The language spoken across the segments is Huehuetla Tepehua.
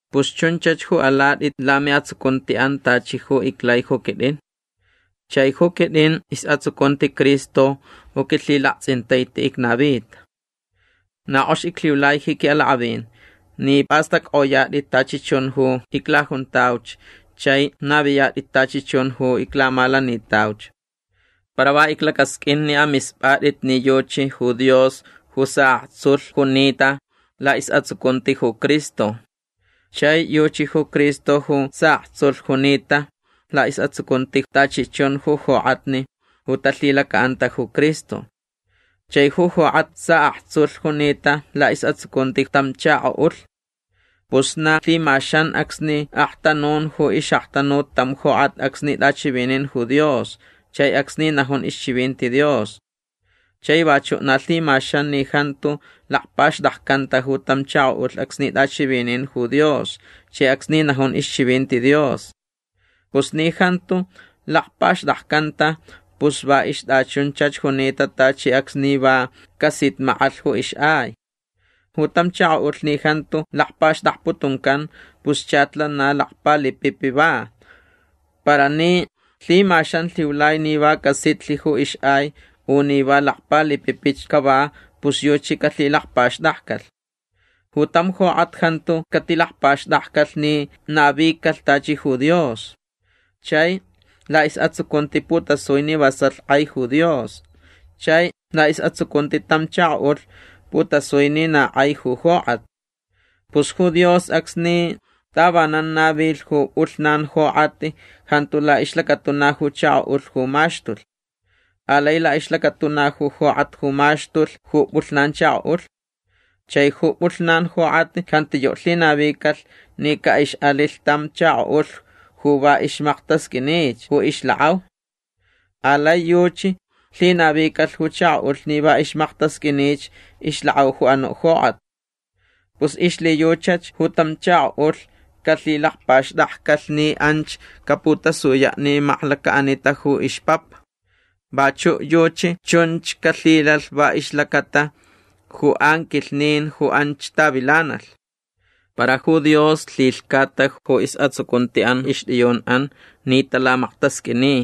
Pus chunchach ju alatʼit lamiʼatsucuntiʼan tachi ju iclai ju quitʼin. Chai ju quitʼin isʼatsucunti Cristo ju quilhilaktsʼintaiti icnavita. Na kʼox iclhiulai ji quiʼalakʼavin ni pʼastʼackʼoyatʼit tachi chun ju iclajuntauch chai naviyatʼit tachi chun ju iclamalanitauch. Para va iclacasqʼuin ni amispʼatʼit ni yuchi ju Dios ju saʼaktsulh junita laʼisʼatsucunti ju Cristo. Chai yuchi ju Cristo ju saʼaktsulh junita laʼisʼatsucunti tachi chun ju jokʼatni ju talhilacaʼanta ju Cristo. Chai ju jokʼat saʼaktsulh junita laʼisʼatsucunti tam chakoʼulh. Pus na lhimaxan acsni aktanun ju ixʼaktanut tam jokʼat acsni tʼachivinin ju Dios chai acsni najun ixchivinti Dios. Chai vachuʼ na lhimaxan ni jantu lakpaxtakcanta ju tam chakoʼulh acsni tʼachivinin ju Dios chai acsni najun ixchivinti Dios. Pus ni jantu lakpaxtakcanta pus va ixtʼachunchach junita tachi acsni va casitmakʼalh ju ixʼai. Ju tam chakoʼulh ni jantu lakpaxtakputuncan pus chach lana lakpalipipi va. Para ni lhimaxan lhiulai ni va casitlh ju ixʼai u ni va lakpalipipich cava pus yuchi calhilakpaxtakcalh. Ju tam jokʼat jantu catilakpaxtakcalh ni navicalh tachi ju Dios. Chai laʼisʼatsucunti putasui ni vasalh kʼai ju Dios. Chai laʼisʼatsucunti tam chakoʼulh putasui ni na kʼai ju jokʼat. Pus ju Dios acsni tavanan navilh ju pʼulhnan jokʼat jantu laʼixlacatuna ju chakoʼulh ju maxtulh. Alai laʼixlacatuna ju jokʼat ju maxtulh ju pʼulhnan chakoʼulh. Chai ju pʼulhnan jokʼat jantiyuʼ lhinavicalh ni caʼixʼalilh tam chakoʼulh ju va ixmaktasqʼuinich ju ixlakʼau. Alai yuchi lhinavicalh ju chakoʼulh ni na ixmaktasqʼuinich ixlakʼau ju anuʼ jokʼat. Pus ixlhiyuchach ju tam chakoʼulh calhilakpaxtakcalh ni anch ju caputasuyaʼ ni maklacaʼanita ju ixpapa. Vachuʼ yuchi chunch calhilalh va ixlacata ju anquilhnin ju anch tavilanalh. Para ju Dios lhilhcata ju isʼatsucuntiʼan ixtʼiyunʼan ni talamaktasqʼuini.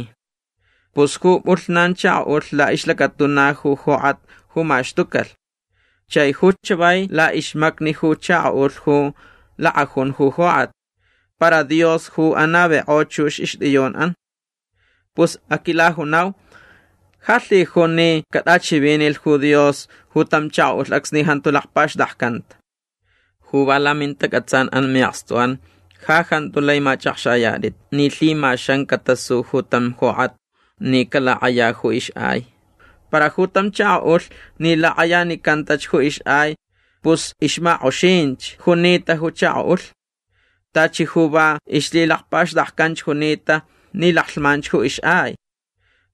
Pus ju pʼulhnan chakoʼulh laʼixlacatuna ju jokʼat ju maxtucalh. Chai ju chavai laʼixmacni ju chakoʼulh ju lakʼajun ju jokʼat. Para Dios ju anavikʼo chux ixtʼiyunʼan. Pus aquilajunau. Ja lhijun ni catʼachivinilh ju Dios ju tam chakoʼulh acsni jantu lakpaxtakcanta. Ju va lamintacʼatsanʼan miʼakstuʼan ja jantu lai machʼakxayatʼit ni lhimaxan catasu ju tam jokʼat ni calakʼaya ju ixʼai. Para ju tam chakoʼulh ni lakʼayanicantach ju ixʼai pus ixmakʼoxinch junita ju chakoʼulh. Tachi ju va ixlhilakpaxtakcanch junita ni laklhman ju ixʼai.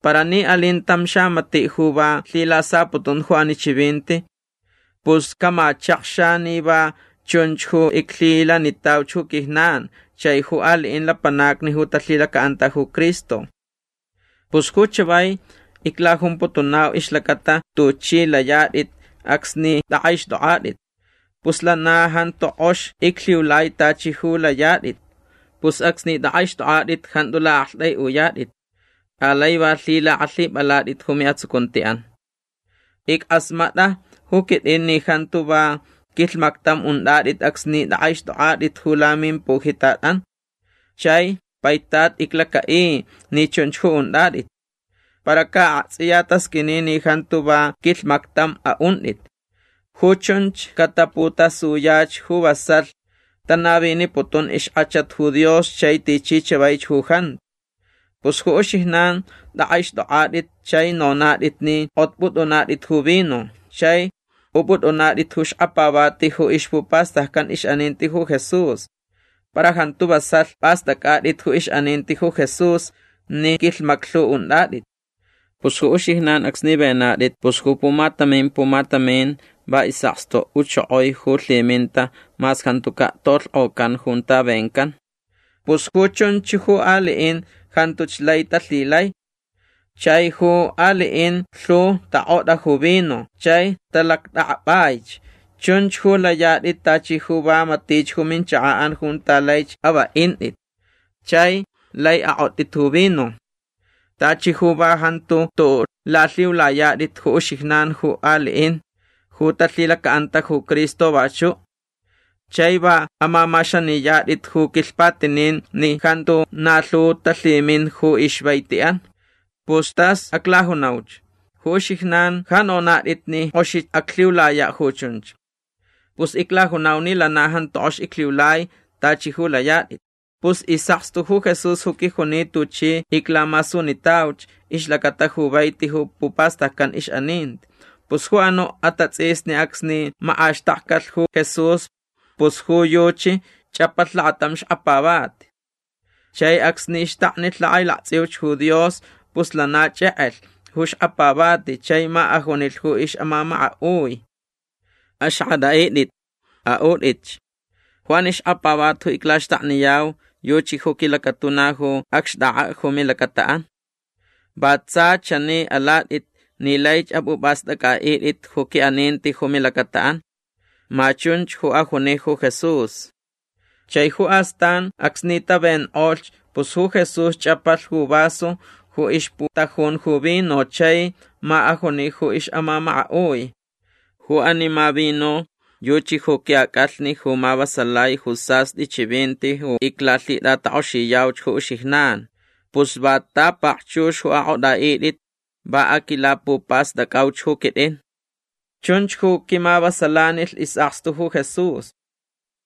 Para ni alin tam xamatiʼ ju va lhilasaputun ju ani chivinti pus camachakxa ni va chunch ju iclhilanitauch ju quijnan chai ju aliʼin lapanacni ju talhilacaʼanta ju Cristo. Pus ju chavai iclajumputunau ixlacata tuchʼi layatʼit acsni tʼakʼaixtʼokʼatʼit. Pus lana jantu kʼox iclhiulai tachi ju layatʼit. Pus acsni tʼakʼaixtʼokʼatʼit jantu laʼaktʼaiʼuyatʼit. Alai va lhilakʼalhipʼalatʼit ju miʼatsucuntiʼan. Ickʼasmatʼa ju quitʼin ni jantu va quilhmactam untʼatʼit acsni tʼakʼaixtʼokʼatʼit ju lamimpujitatʼan. Chai paitat iclacaʼi ni chunch ju untʼatʼit. Para ca aktsʼiya tasqʼuini ni jantu va quilhmactam aʼuntʼit. Ju chunch cataputasuyach ju vasalh tanaviniputun ixkʼachat ju Dios chai tichi chavaich ju jantu. Pus ju uxijnan tʼakʼaixtʼokʼatʼit chai nonatʼit ni kʼotpʼutʼunatʼit ju vino chai upʼutʼunatʼit ju xkapavati ju ixpupastaccan ixʼaninti ju Jesús. Para jantu vasalh pʼastʼacʼatʼit ju ixʼaninti ju Jesús ni quilhmaclhu untʼatʼit. Pus ju uxijnan acsni venatʼit pus ju pumatamin pumatamin va isʼakstu uchokoi ju lhiminta mas jantucaʼ tolhkʼocan junta vencan. Pus ju chunch ju aliʼin jantuch lai talhilai. Chai ju aliʼin lhu takʼotʼa ju vino chai talactʼakʼapʼaich. Chunch ju layatʼit tachi ju va matich ju minchakaʼan junta lai avaʼintʼit chai lai akʼotʼit ju vino. Tachi ju va jantu tuʼuʼ lalhiulayatʼit ju uxijnan ju aliʼin ju talhilacaʼanta ju Cristo vachuʼ. Chai va amamaxaniyatʼit ju quilhpatinin ni jantu na lhu talhimin ju ixvaitiʼan. Pus tas aclajunauch. Ju uxijnan ja nonatʼit ni kʼoxich aclhiulayaʼ ju chunch. Pus iclajunau ni lana jantu kʼox iclhiulai tachi ju layatʼit. Pus isʼakstu Jesús ju quijuni tuchi iclamasunitauch ixlacata ju vaiti ju pupastaccan ixʼaninti. Pus ju anuʼ atatsʼisni acsni makʼaxtakcalh ju Jesús pus ju yuchi chʼapalh lakatam xkapavati. Chai acsni xtaknilh lakʼailaktsʼiuch ju Dios pus lana chʼekʼelh ju xkapavati chai ma ajunilh ju ixʼamamakaʼui: “Axakʼatʼaʼitʼit. Aʼutʼitch. Ju ani xkapavati ju iclaxtakniyau yuchi ju quilacatuna ju acxtʼakʼaʼ ju milacataʼan. Va tsa chani alatʼit ni laich apʼupʼastʼacʼaʼitʼit ju quiʼaninti ju milacataʼan”. Ma chunch ju ajuni ju Jesús. Chai ju astan acsni tavenkʼolhch pus ju Jesús chʼapalh ju vaso ju ixputajun ju vino chai ma ajuni ju ixʼamamakaʼui: “Ju ani ma vino yuchi ju quiʼacʼalhni ju mavasalai ju sastʼi chivinti ju iclalhitʼatakʼoxiyauch ju uxijnan. Pus va ta pakchux ju akʼotʼaʼitʼit va aquilapupastʼacʼauch ju quitʼin”. Chunch ju quimavasalanilh isʼakstu ju Jesús.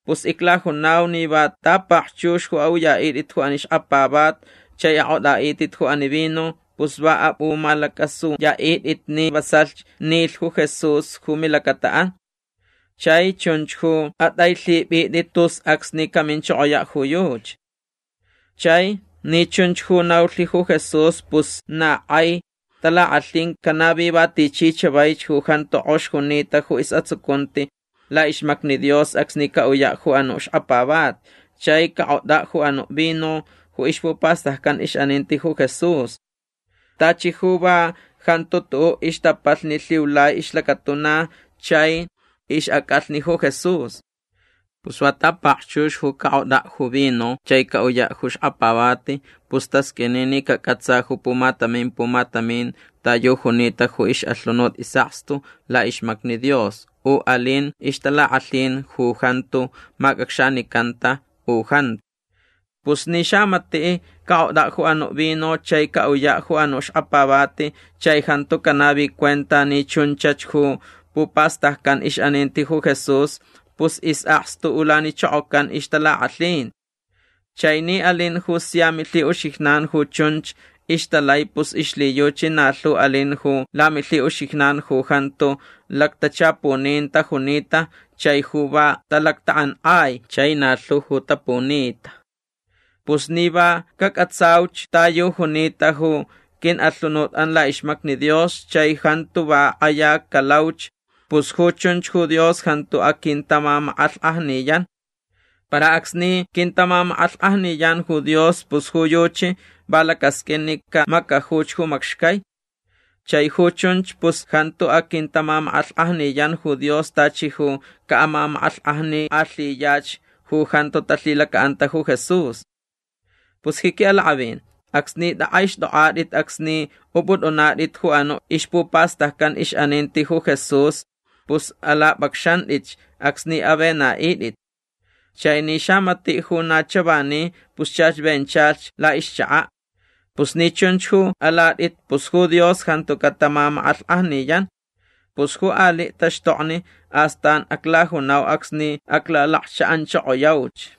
Pus iclajunau ni va ta pakchux ju aʼuyaʼitʼit ju ani xkapavati chai akʼotʼaʼitʼit ju ani vino pus va apʼumalacʼasuyaʼitʼit ni vasalhch nilh ju Jesús ju milacataʼan. Chai chunch ju atʼailhipʼitʼit tus acsni caminchokoyaʼ ju yuchi. Chai ni chunch ju naulh ju Jesús pus na kʼai talakʼalhin canavi va tichi chavaich ju jantu kʼox junita ju isʼatsucunti laʼixmacni Dios acsni caʼuyaʼ ju anuʼ xkapavati chai cakʼotʼaʼ ju anuʼ vino ju ixpupastaccan ixʼaninti ju Jesús. Tachi ju va jantu tuʼuʼ ixtapalhni lhiulai ixlacatuna chai ixʼacʼalhni ju Jesús. Pus va ta pakchux ju cakʼotʼaʼ ju vino chai caʼuyaʼ ju xkapavati pus tasqʼuini ni cacʼatsa ju pumatamin pumatamin ta yu junita ju ixʼalhunut isʼakstu laʼixmacni Dios u alin ixtalakʼalhin ju jantu macʼacxanicanta u jantu. Pus ni xamatiʼ cakʼotʼaʼ ju anuʼ vino chai caʼuyaʼ ju anuʼ xkapavati chai jantu canavi cuenta ni chunchach ju pupastaccan ixʼaninti ju Jesús pus isʼakstu ulanichokocan ixtalakʼalhin. Chai ni alin ju sia milhiʼuxijnan ju chunch ixtalai pus ixlhiyuchi na lhu alin ju lamilhiʼuxijnan ju jantu lactachapunin tajunita chai ju va talactakʼankʼai chai na lhu ju tapunita. Pus ni va cacʼatsauch ta yu junita ju quiʼalhunutʼan laʼixmacni Dios chai jantu va kʼaya calauch pus ju chunch ju Dios jantu aquintamamakʼalhkʼajniyan. Para acsni quintamamakʼalhkʼajniyan ju Dios pus ju yuchi va lacasqʼuin ni camacajuch ju macxcai. Chai ju chunch pus jantu aquintamamakʼalhkʼajniyan ju Dios tachi ju caʼamamakʼalhkʼajnikʼalhiyach ju jantu talhilacaʼanta ju Jesús. Pus ji quiʼalakʼavin acsni tʼakʼaixtʼokʼatʼit acsni upʼutʼunatʼit ju anuʼ ixpupastaccan ixʼaninti ju Jesús pus alapʼacxantʼitch acsni avenaʼitʼit. Chai ni xamatiʼ ju na chavani pus chach venchalh laʼixchakaʼ. Pus ni chunch ju alatʼit pus ju Dios jantu catamamakʼalhkʼajniyan. Pus ju aliʼ taxtokni astan aclajunau acsni aclalakchaʼanchokoyauch.